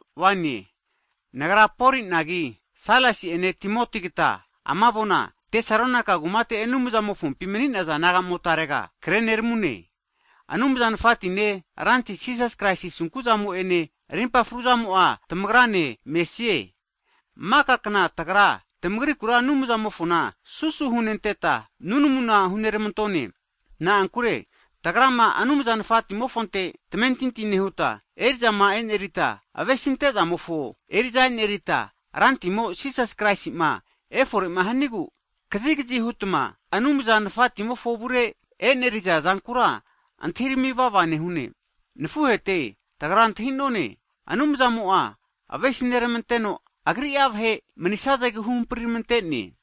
Hagi nagra Polinagi, Sailasi'ene Timotigata ama avona Tesalonaika kumate Anumza Nafatimofompima mani'naza naga'motarega kreneramune. Anumza Nafatine, Ranti Jisas Kraisi asunku'zamo'ene, rimpa fruzamo'a tamagrane mesie. Hagi maka kna tagra, tamagrikura Anumzamofona susu hunenteta, nunamuna huneramantone. Na'ankure tamagrama Anumza Nafatimofonte tamentinti nehuta, eri'zama enerita, vahe avesintezamofo eriza enerita, Rantimo Jisas Kraisi'ma eforema hanigu, kazigazi hutma Anumza Nafatimofo avure e'nerizazankura antahirami vava nehune. Nafuhete, tagra antahi'none, Anumzamo'a avesineramanteno, Agri'a vahe manisazegu huhampritamante'ne.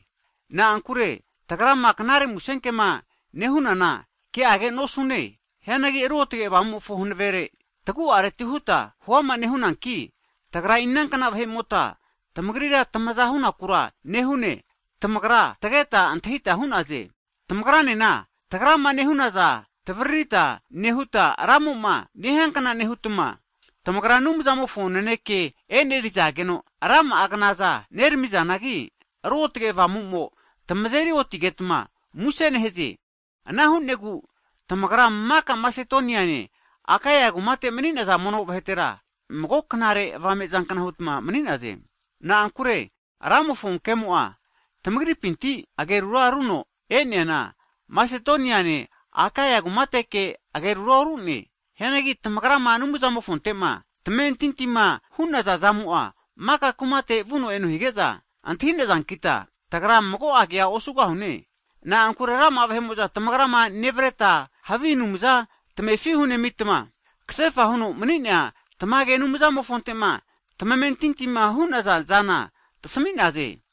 Na'ankure tagrama Knare Musenkema nehunana, ke'age nosune. Hianagi Ruotge Avamumofo hanavere tagu'areti huta huama nehunanki, tagra inankna vahe'mota tamagrira tamaza hunakura nehune, tamagra tageta antahita hu'naze. Tamagranena, tagrama nehunaza tavaririta nehuta, Ramo'ma nehiankna nehutma, tamagra Anumzamofo naneke e'nerizageno, rama'a knazana neramizanagi, Ruotge Avamumo tamazeri otigetma muse nehaze. Ana hu'negu tamagra maka Masedoniane Akaia kumate mani'naza mono vahetera, mago knare avamezankna hutma mani'naze. Na'ankure Ramofo kemo'a tamagripinti agerura runo e'neana, Masedoniane Akaia kumateke agerura orune. Hianagi tamagrama Anumzamofontema tamamentintima hu'naza zamo'a maka kumatega vuno eno hige'za antahi'nazankita, tagra mago kea osugahune. Na'ankure rama'a vahe'mo'za tamagrama neravreta, havi anumzama tamefi hunemitma, kasefa huno mani'nea tamage Anumzamofontema tamamentinti hu'naza zana tasami'naze.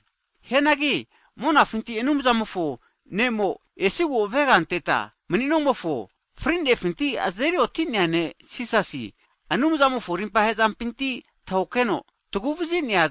Hagi monafinti Anumzamofo mofavremo esigu avega anteta mani'nomofo, frinefinti azeri oti'nea Ne' Jisasi'a, Anumzamofo rimpa hezampinti tahokeno taguvazi'ne.